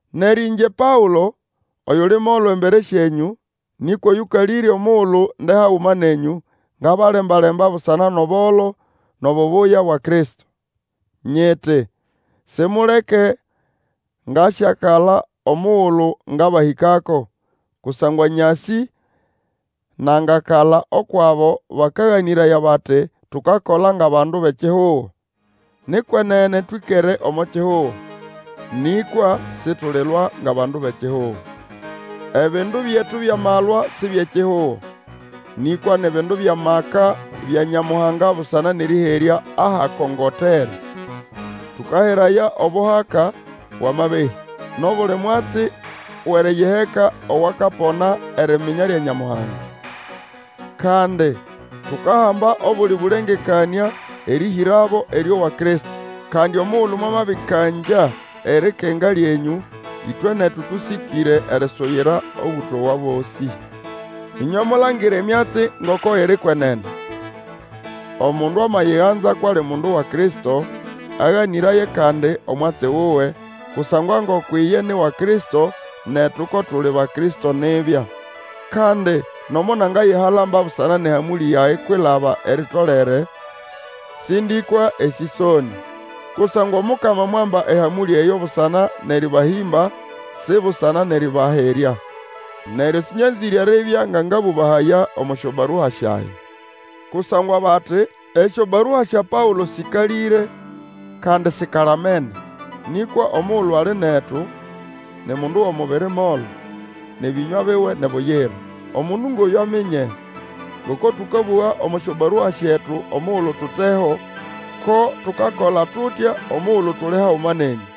Neryo ĩngye Paũlo, oyuli molo embere syenyũ, nĩkwa oyũkalĩre omugulu nde haguma nenyũ, ngabalemba-lemba busana nʼobolo nʼobubuya bwa Kristo, Nyiti, Simuleke ngasyakala omugulu ngabahĩkako, kusangwa nyasĩ nangakala ukwʼabo bakaganĩraya bati tukakola ngʼabandu bʼekihugo. Ni kwenene twĩkere omo kihugo, nĩkwa situlilwa ngʼabandu bʼekihugo. Ebindu byetu byʼamalwa si byʼekihugo, nĩkwa ni bindu byʼamaka bya Nyamuhanga busana nʼerĩherya ahakongotere, Tũkaheraya obuhaka bwʼamabehĩ, nʼobuli mwatsi wʼeriyiheka owakapona eriminya lya Nyamuhanga. Kandi tukahamba obuli bũlengekanĩa erĩhĩrabo erĩowa Kristo. Kandi omugulu mwamabĩkangya erikenga lyenyũ, ĩtwe netu tũsĩkĩre erisuyira Obũtowa bosĩ. Ĩnywe mulangire emyatsi ngoko iri kwenene. Omundu amayiganza kwʼali mundu wa Kristo, aganĩraye kandi omwatsi wuwe, kusangwa ngoko iye ni wa Kristo, netu ko tuli ba Kristo nibya. Kandi nomo nangayihalamba busana nʼehamũlĩ yage kwilaba eritolere, sĩndĩkwa esĩsonĩ. Kusangwa Omukama mwamba ehamũlĩ eyo busana nʼerĩbahĩmba, si busana nʼerĩbaherya. Neryo sĩnyanzĩre eribya nga ngabũbahaya omo syobarua syage. Kusangwa bati, Esyobarua sya Paũlo sĩkalĩre kandi sikalamene, nĩkwa omugulu ali netu, ni mundu wʼomubiri molo, nʼebĩnywa biwe ni buyira! Omundu ngʼoyũ aminye, ngoko tũkabũga omo syobarua syetu omugulu tuteho, ko tukakola tutya omugulu tuli haguma nenyũ.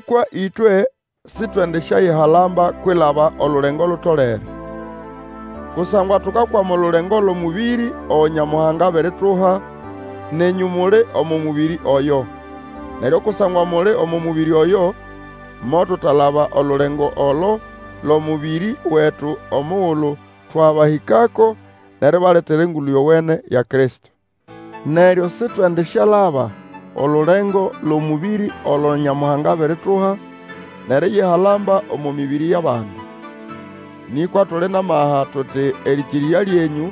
Nĩkwa ĩtwe sitwendisyayihalamba kwilaba olulengo lutolere. Kusangwa tukakwama olulengo lwʼomũbĩrĩ ogo Nyamuhanga abirituha, nenyũ muli omo mũbĩrĩ oyo. Neryo kusangwa muli omo mũbĩrĩ oyo, motutalaba olulengo olo lwʼomũbĩrĩ wetu omugulu twabahĩkako nʼeribaletera Engulu Yowene ya Kristo. Neryo Sitwendisyalaba olulengo lwʼomũbĩrĩ olo Nyamuhanga abirituha, nʼeriyihalamba omo mĩbĩrĩ yʼabandi. Nĩkwa tuli nʼamaha, tuti erĩkĩrĩrya lyenyũ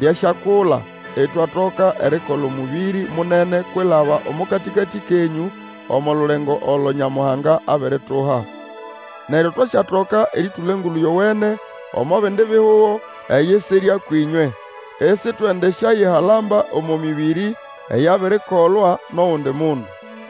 lyasyakula, itwatoka erikola omũbĩrĩ munene kwilaba omo katĩkatĩ kenyũ omo lulengo olo Nyamuhanga abirituha. Neryo twasyatoka erĩtũla Engulu Yowene omo bindi bihugo eyisirya kwĩnywe. Isitwendisyayihalamba omo mĩbĩrĩ eyabirikolwa nʼogundi mundu.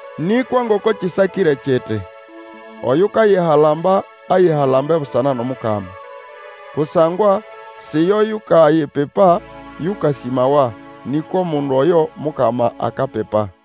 Nĩkwa ngoko kĩsakĩre kiti, Oyukayihalamba, ayihalambe busana nʼomukama. Kusangwa, si yo yukayipipa yũkasĩmawa, nĩkwa omundu oyo Mukama akapipa.